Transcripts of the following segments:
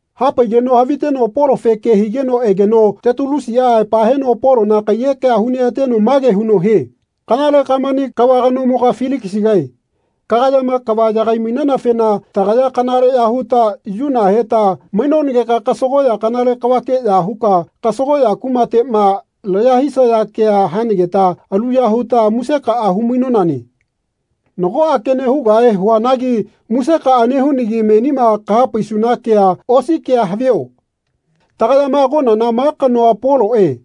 Hapaigeno haviteno Polofe ke higeno egeno Tetulusiꞌa aepa heno Polona kaiyekea huneꞌateno mage huno hie “Kanale Kamani kava kanomoga Filikisigae kagayama kava yagai-mainanafena tagaya kanaleꞌya huta yuna heta mainonageka kasagoꞌya kanale kavakeꞌya huka kasagoꞌya kumateꞌma laya hisana kea hanageta aluya huta musekaꞌa humainonane. Nagoꞌa kene hugahe huanagi amusekaꞌa nehunagi menima kahapaisuna kea osi kea havio. Tagayama agonana ma kanoa Poloꞌe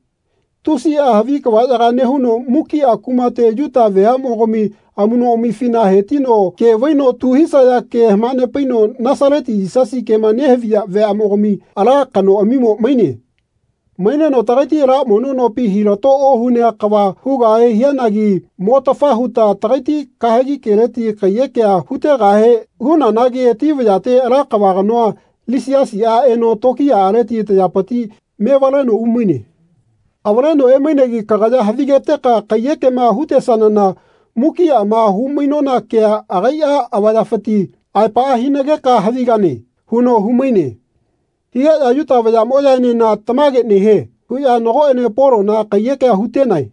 tusiꞌa havi kavaꞌyaga nehuno mukiꞌa kumate Yuta veaꞌmogami amuꞌnoꞌamifina hetino ke vaino tu hisaya ke hamanepaino Nasaleti Yisasi kema nehaviya veaꞌmogami ala kanoꞌami maine. Maineno tagaiti ala mono nopi hilato ohunea kava hugahe hianagi mo-tafa huta tagaiti kahegi keleti kaiyekea hutegahe hunanagi ati vayate ala kava kanoa Lisiasiꞌa eno tokiyaꞌaleti tayapiti mevaleno umaine. Avaleno emainegi kagaya havigeteka kaiyekema hutesanana mukiꞌama humainona kea agaiꞌa avayafiti aepaꞌa hinageka havigane.” huno humaine. Higeꞌya Yuta vayaꞌmoꞌyaenena “Tamage nehie.” huꞌya nagoꞌene Polona kaiyekea hutenae.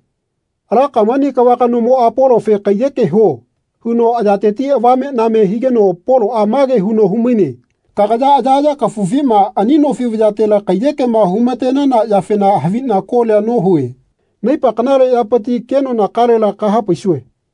Ala Kamani kava kanomoꞌa Polofe “Kaiyeke huo.” huno ayateti avameꞌname higeno Poloꞌa mage huno humaine kagaya ayaꞌaya kafufima ani nofi vayatela kaiyekema humatenana yafena haviꞌna kolia nohue. Naipa kanale yapiti kenonakalela kahapaisue.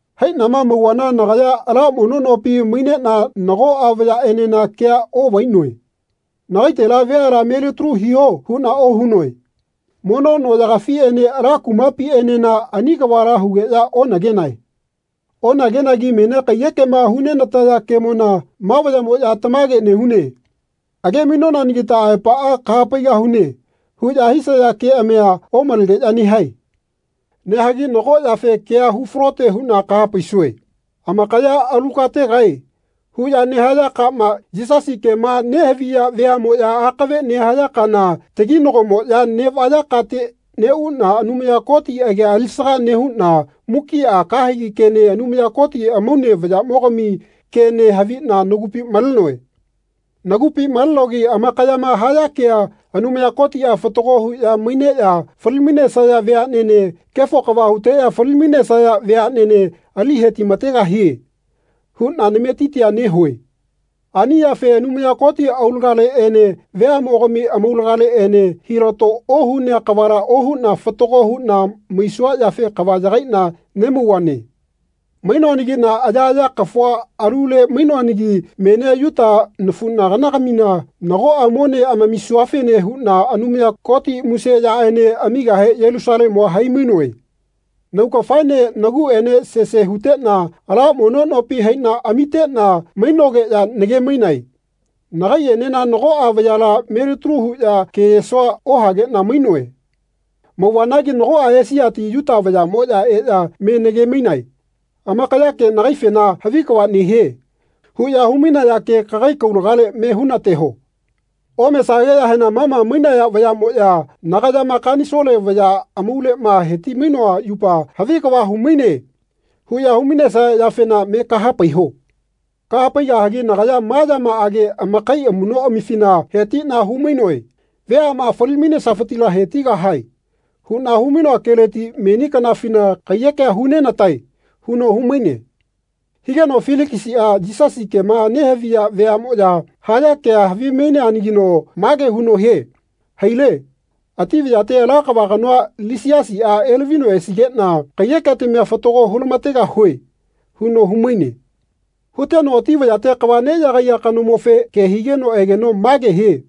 Haiꞌnama mauvana nagaya ala mono nopi maineꞌna nagoꞌa vayaꞌenena kea oꞌvainoe. “Nagaitela veala melitalu hiho.” huꞌna ohunoe. Mono noꞌyagafiꞌene ala kumapiꞌenena ani kavala hugeꞌya onagenae. Onagenagi menia kaiyekema hunenataya kemona ma vayaꞌmoꞌya “Tamage nehune. Age-mainonanagita aepaꞌa kahapaigahune.” huꞌya hisaya keꞌamia omalegeꞌya nehae. Nehagi nago yafe kea hu-falote huꞌna kahapaisue. Amakayama “Alu kategae.” huꞌya nehaya kama, Yisasi kema nehaviya veaꞌmoꞌya akave nehaya kana, taginagomoꞌya neꞌvaya kate neꞌuꞌna Anumaya Koti agia alisaga nehuꞌna mukiꞌa kahegi kene Anumaya Koti amaune vayaꞌmogami kene haviꞌna nagupi malenoe. Nagupi malenogi amakayama haya kea “Anumaya Kotiꞌa fatago huꞌya maineꞌya fali-mainesaya veaꞌnene kefo kava huteꞌya fali-mainesaya veaꞌnene ali hetimategahie.” huꞌna nametitia nehue. Ani yafe Anumaya Koti aulagaleꞌene veaꞌmogami amaulagaleꞌene hilato ohunea kavala ohuꞌna fatago huꞌna maisua yafe kava yagaiꞌna nemauvane. Mainoanagiꞌna ayaꞌaya kafua alule mainoanagi menia Yuta nafuꞌnaganagamina nagoꞌa mone amamisuafene huꞌna Anumaya Koti muse yaꞌene amigahe Yelusalemua hai-mainoe. Naugafaene naguꞌaene sese huteꞌna ala mono nopi haiꞌna amiteꞌna mainogeꞌya nage-mainae. Nagaiꞌenena nagoꞌa vayala me-litalu huꞌya keyesoa ohageꞌna mainoe. Mauvanagi nagoꞌa Esiati Yuta vayaꞌmoꞌya eꞌya me nage-mainae. Amakayake nagaifena “Havi kava nehie.” huꞌya humainaya ke kagai kaulagale me hunateho. Omesageꞌyahena ma ma mainaya vayaꞌmoꞌya nagayama Kanisole vaya amauleꞌma heti-mainoa yupa “Havi kava humaine.” huꞌya humainesaya yafena me kahapaiho. Kahapaigahagi nagaya ma yamaꞌage amakai amuꞌnoꞌamifina hetiꞌna humainoe “Veaꞌma fali-mainesafitila hetigahae.” huꞌna humainoa keleti meni kanafina kaiyekea hu-nenatae huno humaine. Higeno Filikisiꞌa Yisasi kema nehaviya veaꞌmoꞌya haya kea havimaineanagino mage huno hie “Haile. Ati vayate ala kava kanoa Lisiasiꞌa elavino esigeꞌna kaiyeketamia fatago hulamategahue.” huno humaine. Huteno ati vayate kava neꞌyagaiya kanomofe ke higeno egeno mage hie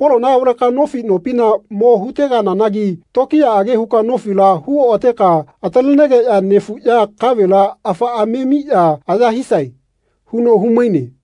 “Polona avaleka nofi nopina mo hutegananagi tokiyaꞌage huka nofila hu oꞌateka atalenegeꞌya nefuꞌya kavela afaꞌa memiꞌya aya hisae.” huno humaine.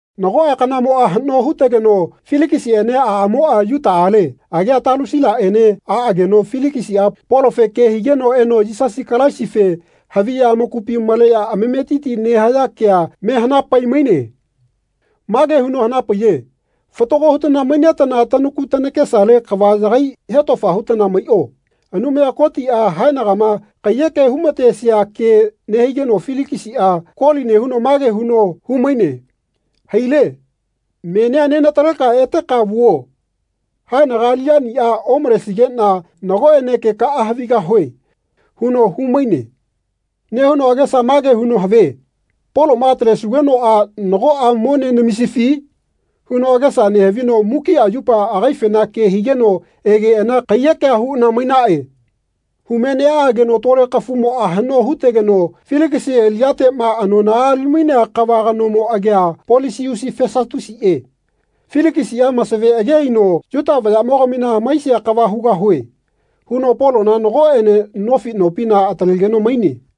Nagoꞌa kanamoꞌa haꞌno hutegeno Filikisiꞌene aꞌamoꞌa Yuta ale agia Talusilaꞌene aꞌageno Filikisiꞌa Polofe ke higeno eno Yisasi Kalaisife haviꞌya amakupima maleꞌya amametiti nehaya kea mehanapai-maine. Mage huno hanapaiye “Fatago hutana mainetana tanaku tanakesale kava yagai hetofa hutana maiꞌo.” Anumaya Kotiꞌa haenagama kaiyeke humatesia ke nehigeno Filikisiꞌa koli nehuno mage huno humaine “Haile. Menia nenataleka eteka vuo. Haenaga aliꞌyaniꞌa omalesigeꞌna nagoꞌene kekaꞌa havigahue.” huno humaine. Nehuno agesa mage huno havie “Poloma atalesugenoꞌa nagoꞌa mone namisifi?” huno agesa nehavino mukiꞌa yupa agaifena ke higeno egeꞌana kaiyekea huꞌana mainaꞌe. Hume neꞌaꞌageno tole kafumoꞌa haꞌno hutegeno Filikisi aliꞌyateꞌma anonaꞌa alimainea kava kanomo agia Polisiusi Fesatusiꞌe. Filikisiꞌa masave ageꞌaino “Yuta vayaꞌmogamina hamaisia kava hugahue.” huno Polona nagoꞌene nofi nopina atalegeno maine.